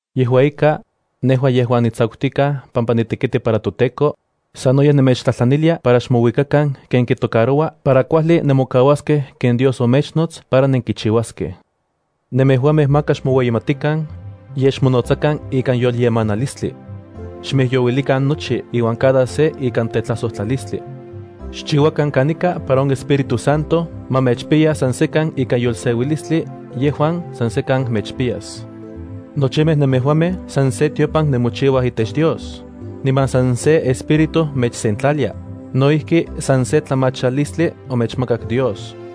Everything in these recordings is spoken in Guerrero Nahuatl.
Yejua ika, nejua yejuan nitsakutikaj pampa nitekiti para toTEKO, sanoyej nemechtlajtlanilia para xmouikakan ken kitocaroua para kuajli nemokauaskej ken Dios omechnots para nenkichiuaskej. Nemejuamej maka xmoueyimatikan, yej xmonotsakan ikan yolyemanilistli. Xmijyouilikan nochi iuan cada se ikan tetlajsojtlalistli. Xchiuakan kanika para on Espíritu Santo ma mechpiya san sekan ikan yolseuilistli yejuan san sekan mechpiyas. Nochimej nemejuamej san se tiopan nemochiuaj itech Dios, niman san se Espíritu mechsentlalia, no ijki san se tlamachalistli omechmakak Dios.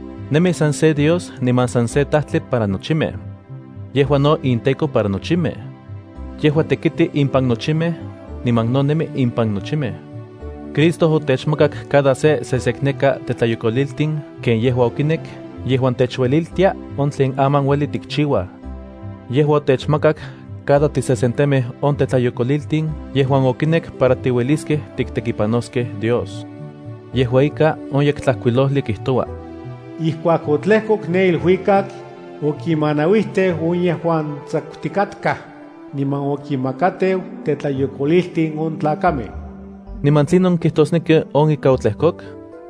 Nemi san se Dios niman san se Tajtli para nochimej. Yejua no inTEKO para nochimej. Yejua tekiti impan nochimej, niman no nemi impan nochimej. Cristo otechmakak cada se sesekneka tetlayokoliltin ken yejua okinek yejuan techueliltia on tlen aman ueli tikchiuaj. Yejua otechmakak cada tisesentemej on tetlayokoliltin yejuan okinek para tiueliskej tiktekipanoskej Dios. Yejua ika, on Yektlajkuilojli kijtoua: Ijkuak otlejkok ne iluikak, okinmanauijteu on yejuan tsakutikatkaj, niman okinmakateu tetlayokoliltin on tlakamej. (¿Niman tlinon kijtosneki on ika otlejkok?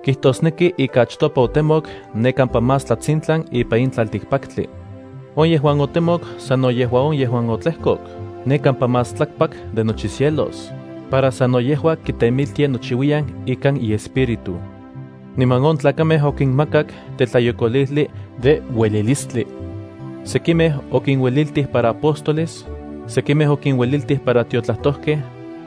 Kijtosneki ika achtopa otemok ne kampa más tlatsintlan ipan in tlaltikpaktli. On yejuan otemok sano yejua on yejuan otlejkok ne kampa más tlakpak de nochi cielos, para sano yejua kitemiltia nochiuiyan ikan iEspíritu.) Niman on tlakamej okinmakak tetlayokolijli de uelilistli. Sekimej okinueliltij para apóstoles, sekimej okinueliltij para tiotlajtojkej,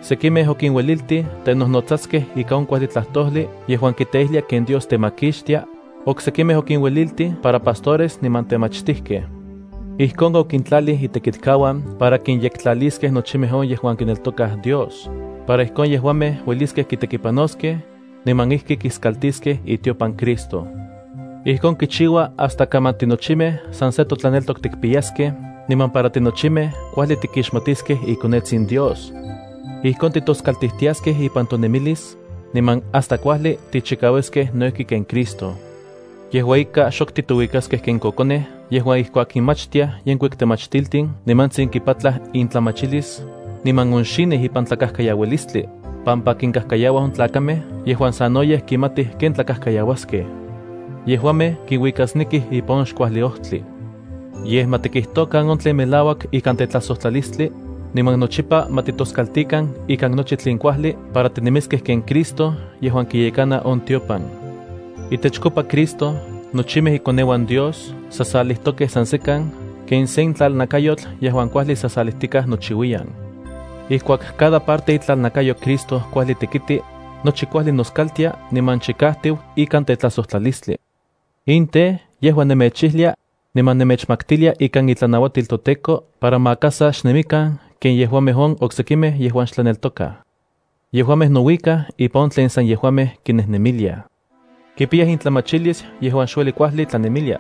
sekimej okinueliltij tenojnotsaskej ika on kuajli tlajtojli yejuan kiteijlia ken Dios temakixtia, oksekimej okinueliltij para pastores niman temachtijkej. Ijkon okintlalij itekitkauan para kinyektlaliskej nochimej on yejuan kineltokaj Dios para ijkon yejuamej ueliskej kitekipanoskej, niman ijki kiskaltiskej itiopan Cristo. Ijkon kichiua hasta kaman tinochimej san se totlaneltok tikpiyaskej niman para tinochimej kuajli tikixmatiskej ikonetsin Dios. Ijkon titoskaltijtiaskej ipan tonemilis, niman hasta kuajli tichikauiskej no ijki ken Cristo. Yejua ika, xok titouikaskej ken kokonej yejuan ijkuak kinmachtiaj yenkuik temachtiltin nimantsin kipatlaj intlamachilis, niman onxinij ipan tlakajkayaualistli, pampa kinkajkayauaj on tlakamej yejuan sanoyej kimatij ken tlakajkayauaskej. Yejuamej kinuikasnekij ipan on xkuajli ojtli. Yej, ma tikijtokan on tlen melauak ikan tetlajsojtlalistli, niman nochipa ma titoskaltikan ikan nochi tlen kuajli para tinemiskej ken Cristo yejuan kiyekana on tiopan. Itechkopa Cristo nochimej ikoneuan Dios sasalijtokej san sekan ken sen tlalnakayotl yejuan kuajli sasalijtikaj nochiuiyan. Ijkuak cada parte itlalnakayo Cristo kuajli tekiti, nochi kuajli noskaltia niman chikajtiu ikan tetlajsojtlalistli. In tej, yejua nemechijlia, niman nemechmaktilia ikan itlanauatil toTEKO para maka sa xnemikan ken yejuamej on oksekimej yejuan xhebreos. Yejuamej nouikaj ipan on yejuan sanenkaj kinejnemiliaj. Kipiyaj intlamachilis yejuan xueli kuajli tlanemilia.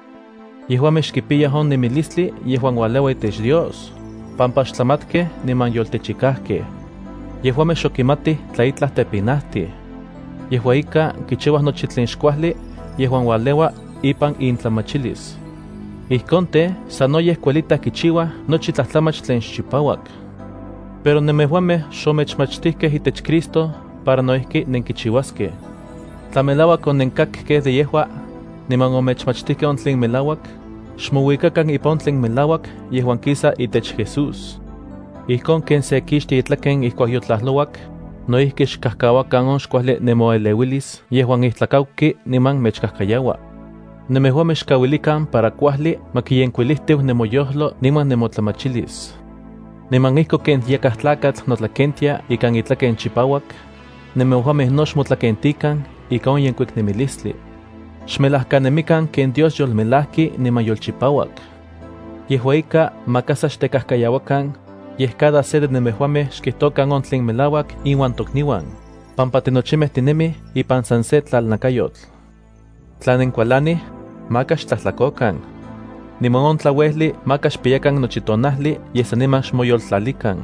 Yejuamej xkipiyaj on nemilistli yejuan ualeua itech Dios, pampa xtlamatkej niman yoltechikajkej. Yejuamej xok kimatij tla itlaj tepinajtij. Yejua ika, kichiuaj nochi tlen xkuajli yejuan ualeua ipan intlamachilis. Ijkon tej, sanoyej kuelitaj kichiuaj nochi tlajtlamach tlen xchipauak. Pero nemejuamej xomechmachtijkej itech Cristo para no ijki nenkichiuaskej. Tla melauak onenkakkej de yejua, niman omechmachtijkej on tlen melauak, xmouikakan ipan on tlen melauak yejuan kisa itech Jesús. Ijkon ken se kixtia itlaken ijkuak yotlajlouak, no ijki xkajkauakan on xkuajli nemoeleuilis yejuan itlajkauki niman mechkajkayaua. Nemejuamej xkauilikan para kuajli ma kiyenkuilijtiu nemoyojlo niman nemotlamachilis. Niman ijkon ken yakaj tlakatl notlakentia ikan itlaken chipauak, nemejuamej no xmotlakentikan ika on yenkuik nemilistli. Xmelajkanemikan ken Dios yolmelajki niman yolchipauak. Yejua ika, maka sa xtekajkayauakan, yej cada se de nemejuamej xkijtokan on tlen melauak inuan tokniuan, pampa tinochimej tinemij ipan san se tlalnakayotl. Tla nenkualanij, maka xtlajtlakokan. Niman on tlauejli maka xpiyakan nochi tonajli, yej saniman xmoyoltlalikan.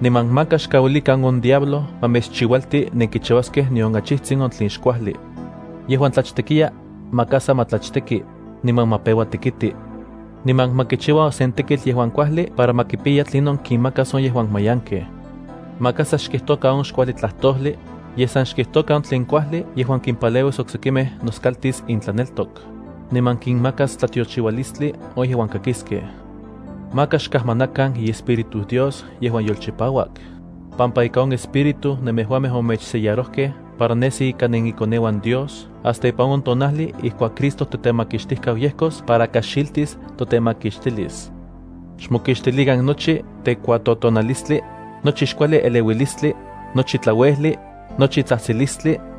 Niman maka xkauilikan on diablo ma mechchiualti nenkichiuaskej nion achijtsin on tlen xkuajli. Yejuan tlachtekiya, maka sa ma tlachteki, niman ma peua tekiti. Niman ma kichiua sen tekitl yejuan kuajli para ma kipiya tlinon kinmakas on yejuan mayankej. Maka sa xkijtokan on xkuajli tlajtojli, yej san xkijtokan tlen kuajli yejuan kimpaleuis oksekimej noskaltis intlaneltok, niman kinmakas tlatiochiualistli on yejuan kakiskej. Maka xkajmanakan iEspíritu Dios yejuan yolchipauak, pampa ika on Espíritu nemejuamej omechsellarojkej para nesi ika nenikoneuan Dios hasta ipan on tonajli ijkuak Cristo totemakixtijkau yejkos para kaxiltis totemakixtilis. Xmokixtilikan nochi tekuatotonalistli, nochi xkuajli eleuilistli, nochi tlauejli, nochi tsajtsilistli,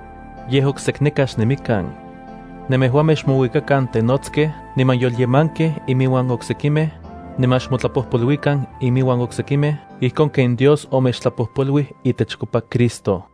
Yej oksekneka xnemikan. Nemejuamej xmouikakan tenotskej niman yolyemankej iminuan oksekimej, niman xmotlapojpoluikan iminuan oksekimej ijkon ken Dios omechtlapojpoluij itechkopa Cristo.